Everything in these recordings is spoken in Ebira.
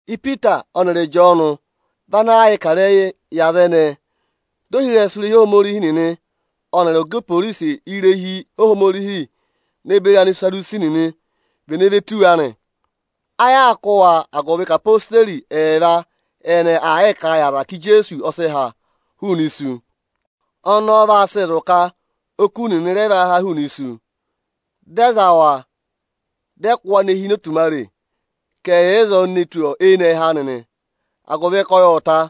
Ipita ọnịrị Ịjọọnụ vị ana aa yịị kà ịrẹyịị yị aza ẹnẹẹ, dị ohirẹsụ irehi Ohomorihi nịnị ọnịrị ọga iporisi irehi Ohomorihi ne beri Anisadusi nịnị vene ve tù wa nị. Ayị aa kụ́ wa, agụvị ka odeyi ẹẹva ẹnẹẹ aa kà a yị aza ka Ijeesu ọ sị ha hụụnị isu. Ọnọọ vaa sị zụ̀ ka oku nịnị rẹ vaa haa hụụnị isu. Dị ẹ za wa, dị ẹ kụ́ wa ne hi ini otumare, ka ẹ̀ yà ịzọọ ne tù eyinẹhẹ anị nị, agụvị ka ọyị ộ ta.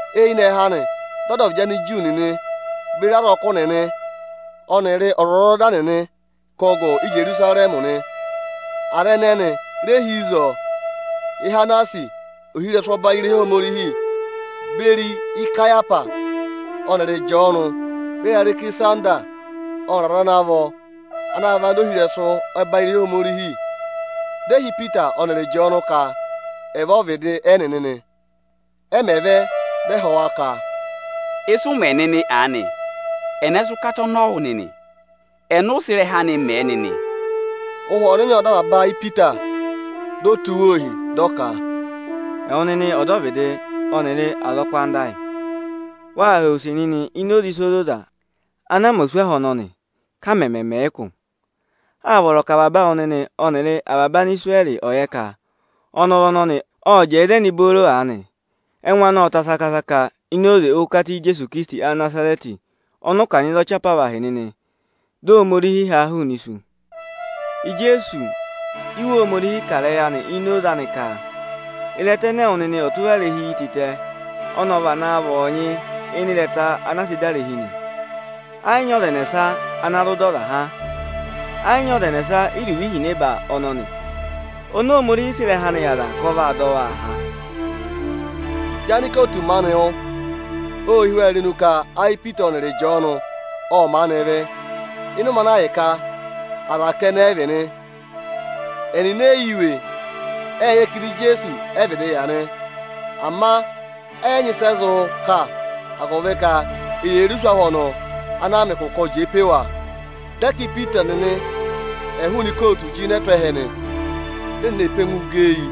Eyinẹhẹ anị, dị ọdọvịdị Aniju nịnị beri azọkụ nịnị ọnịrị ọzwọzọda nịnị kụ́ gụ Íjerusarẹmị nị. Aza ẹnẹnị re hi ịzọọ: Ihanasi ohirẹsụ ọbanyị irehi Ohomorihi, beri Ikayahwasi ọnịrị Ịjọọnụ ne beri Arẹkịsanda ọnịrị aza ana vọ ana vị anda ohirẹsụ ọbanyị irehi Ohomorihi. Dị ẹ hị́ Ipita ọnịrị Ịjọọnụ ka ẹ̀ vẹ ọ́vịdị ẹnịnị nị. Ẹ mẹ̀ vẹ, dị ẹ họ̀ wa ka, “Ịsị ụ mẹ nịnị aanị, ẹnẹ sị ụkata ọnọọ wụ nịnị? Ẹnị ụ sị ịrẹha anị mẹ̀ ẹ nịnị?” Ụhwẹ Ọnịnị ộ dọ avaba ayị Ipita, di o tụ́ wa ohi dị ọ ka, “Ẹwụ nịnị ọdọvịdị ọnịrị azọkụ anda ayị! Wàa họ̀ yị use nịnị ini oze ịsa ozoza ana mẹ oswahụ ọnọnị, ka a mẹmẹ mẹ̀ ẹ ụkụ. Â vọrọ ka avaba awụ nịnị ọnịrị avaba Anisirẹrị ọ̀ yẹ ka ọnọrụ ọnọnị ộ jẹẹ ịzẹnị booro aanị, ẹngụ anị ộ ta saka-saka ini oze ụkata Ijeesu Ikirisiti Anịnazarẹtị, ọnị ụ kanyị za ọchị apavahị nịnị, dị Ohomorihi ha a hụụnị isu. Ijeesu Íwe Ohomorihi kà ịrẹyị ini oze anị nị, ka ‘Ịrẹta ẹnẹ ẹwụ nịnị ọtụrarehi yi tịtẹ, ọnị ọ vana vị ọọnyị ịnị ịrẹta ana a sịị̄ dà irehi nị.’ Ẹ yị nyị ọza ẹnẹsa ana zụ dọ ọza há, Ẹ yị nyị ọza ẹnẹsa íruvo ihinẹba ọnọnị oni Ohomorihi sị ịrẹha anị yị aza ka ọ̀ọ dọ waa há.” Ịjị anikootu maanị wụ́, ô hí wa irenu ka ayị Ipita ọnịrị Ịjọọnụ ọ́ maanị vị́, ịnị ụmẹ ana ahịka aza kẹnẹ ẹ vị nị, ẹnịnị ẹ yị yẹ iwe. Ệ yẹ ka ịdị Ijeesu ẹ vịdị yà nị. Ama ẹ yị nyị ịsị ẹ zụ kà, agụvị ka eyee re oswahụ ọnọọ ana a mẹ ụkụ ka ọ jẹẹ pe wa. Dị ẹ ka Ipita nịnị ẹ̀ hụụnị ikootu jịnẹ tụ́ ẹhẹ nị. Dị ẹnịnị ee pe ẹngụụ gẹ eyi,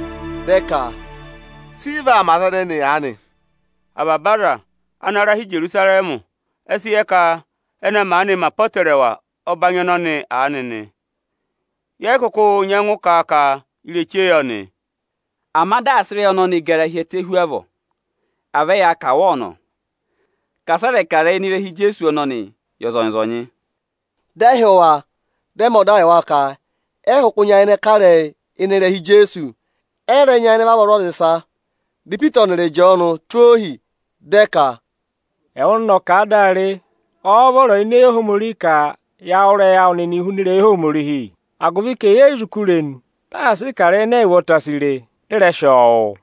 dị ẹ ka, “Sị ị vaa mẹ aza ẹnẹnị aanị? Avaba aza ana ra hi Ijerusarẹmị ẹ sị yẹ ka ẹnị ẹ maanị mẹ apọtẹrẹwa ọbanyị ọnọnị aanị nị. Yẹ yị kụkụ nyẹngụ kà a ka ireche yọ nị. Ama dị asị ịrẹyị ọnọnị gara hi ẹtẹ hu avọọ, à vẹ ya kà wa ọnọ ka asị ẹ rẹ̀ kà ịrẹyị ịnị ịrẹha Ijeesu ọnọnịị yị ọzọnyị-ọzọnyị.” Dị ẹ hị́ wa, dị ẹ mẹ ọda yị wa ka ẹ yị kụkụ nyayịnẹ kà ịrẹyị ịnị ịrẹha Ijeesu, ẹ yị rẹ nyayịnẹ vavọọ zụ̀ aza ịsa nị. Dị Ipita ọnịrị Ịjọọnụ tụ́ ohi dị ẹ ka, “Ẹwụ nịnị ọ̀ kà a dị a re, ọ́ọ́ vọrọ ini eyi Ohomorihi ka ya wụ́ ịrẹyị awụ nịnị huna ịrẹyị Ohomorihi? Agụvị ka ẹyị e yi zụ kú irenu, dị asị ị kà ịrẹyị ẹnẹ ẹyị ụvọta si re, dị ị rẹ sị ọọ wụ́.”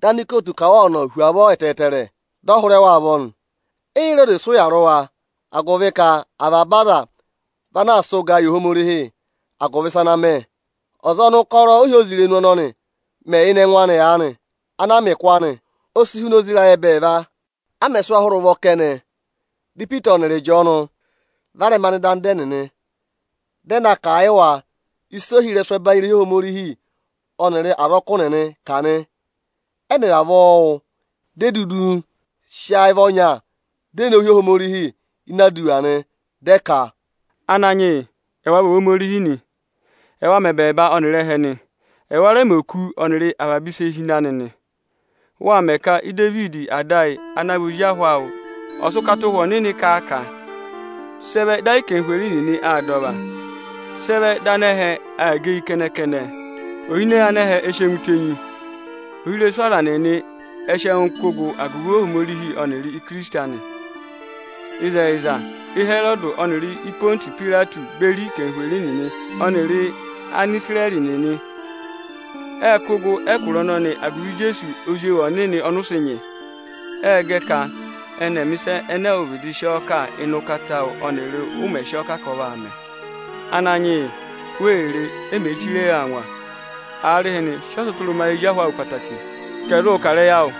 Dị anikootu kà wa ọnọ hu avọọ ẹtẹẹtẹrẹ, dị ẹ hụrẹ wa ụvọ nị. E yi re oze sị ụya rị wa, agụvị ka avaba aza vị ana aa sị ụgaa yị Ohomorihi agụvị ịsa ana mẹ. Ọza ọnị ụkọrọ ohyozirenu ọnọnị mẹ ịnị ẹngụ anị ana a mẹ ụkụ aanị, o si huna ozi ịrayị ẹbẹẹva. A mẹ̀ sị wa hụrẹ ụvọ kẹnẹ, dị Ipita ọnịrị Ịjọọnụ varẹma nọ ịdị anda ẹnịnị, dị ẹ na kà a yị wa ịsị ohirẹsụ ẹbanyị irehi Ohomorihi ọnịrị azọkụ nịnị kà nị. Ẹ mẹ̀ vavọọ wụ́, di e dudu sị ayị vị ọnya, di e nowu hị́ Ohomorihi nị. Dị ẹ ka: Ohi-ọmenezeyi Ananyịwa, ẹwa mẹ ẹbẹẹba ọnịrị ẹtẹ nị. Ẹwa rẹ mẹ òkū ọnịrị avaba ịsị e hi ịnị anị nị. Wâ mẹ ka Idevidi ada ayị ana vị ozi ahụ awụ ọ̀ sị ụkata Ụhwẹ Ọnịnị kà a ka: “Sị ẹ vẹ dị ayị anarịmadọwụ nịnị aa dà ọva, sị ẹ vẹ dị anẹhẹ aa gẹ eyi kẹnẹ-kẹnẹ? Ohinọyị anẹhẹ ẹ sị ẹngụ tenyi, ohirẹsụ aza nịnị ẹ sị ẹngụ kụ́ gụ agụvị Ohomorihi ọnịrị Ikirisiti anị. Ịzẹyịza, Ịhẹrọdị ọnịrị Ịpọntụsị Ipayireti beri anarịmadọwụ nịnị ọnịrị Anisirẹrị nịnị ệ kụ́ gụ ẹkụra ọnọnị agụvị Ijeesu Ozi ewu ọnịnị ọnị ụ sị nyị. Ệ gẹ ka ẹnị ẹ̀ mẹ̀ ịsa ẹnẹ ẹwụ vịdị sị ọọ kà ịnị ụkata awụ ọnịrị u mè sì ọ ka ọ vaa mẹ. Ananyị yị, wee re, e mèe chire yi angwa. Aarịhịnị, sị ọtụtụrụma yị ezi ahụ awụ ẹtẹẹtẹrẹ ka ẹ̀ zụụ kà ịrẹyị awụ!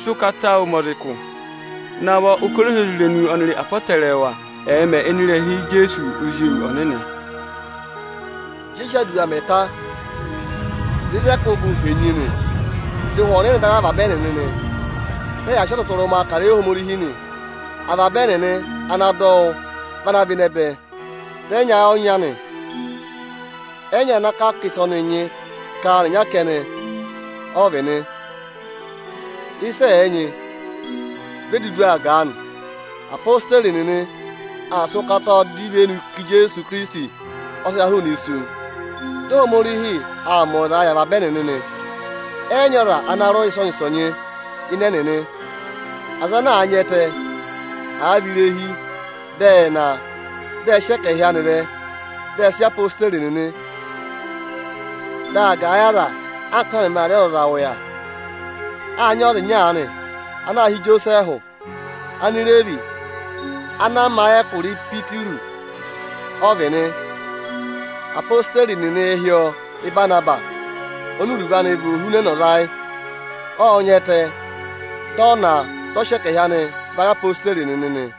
Sị ụkata awụ mẹ aza ụkụ! Navọ ụkọrọ ohyozirenu ọnịrị apọtẹrẹwa ẹ̀ẹ mẹ ịnị ịrẹha Ijeesu Ozi ewu ọnịnị!” Ịjị ẹ sị aduwa mẹ̀ ta, dị ịzị ẹ kụ́ gụ henyi nị. Dị Ụhwẹ Ọnịnị dọ ayị avaba ẹnịnị, dị ẹyaa sị ọtụtụrụma kà ịrẹyị Ohomorihi nị. Avaba ẹnịnị ana dọ wụ́ vị ana và ịnẹ bẹ, dị ẹ nyị ayị ọnya nị. Ẹ yị nyị ọza ana kà a ka ịsị ọnị nyị ka áanị ịnyara kẹnẹ ọ vị nị. Ịsị ẹ̀ẹ nyị, vi e dudu aa gà a nị. Apositeri nịnị ệ sị ụkataa dọ ivenu ka Ijeesu Ikirisiti ọ sị ha hụụnị isu. Dị Ohomorihi aa mẹ ọyịzaa yị avaba ẹnịnị nị. Ẹ yị nyị ọza ana rị ụya ịsọnyị-ịsọnyị ịnị ẹnịnị. Aza ana àa nyị ẹtẹ, àa vị irehi, dị ẹ ná a, dị ẹ sị ẹkẹhị anị vẹ, dị ẹ sị yị odeyi nịnị. Dị aa gà ẹ yị aza, anka ị́sa mẹmẹ aa rị ọzọza ụya. Â nyị ọza ịnya aanị ana aā hị́ Ijosẹẹhụ. Anireevi ana a ma ẹkụra Ịsayịpịrụsị, ọ vị nị. Apositeri nịnịị̄ hị́ ọọ Ịbanabasị, oni iruvo anị vị “Ọtwọzọtụtụrụma”. Ộ nyị ẹtẹ, dị ọ ná a, dị ọ sị ẹkẹhị anị va yị odeyi nịnị nị.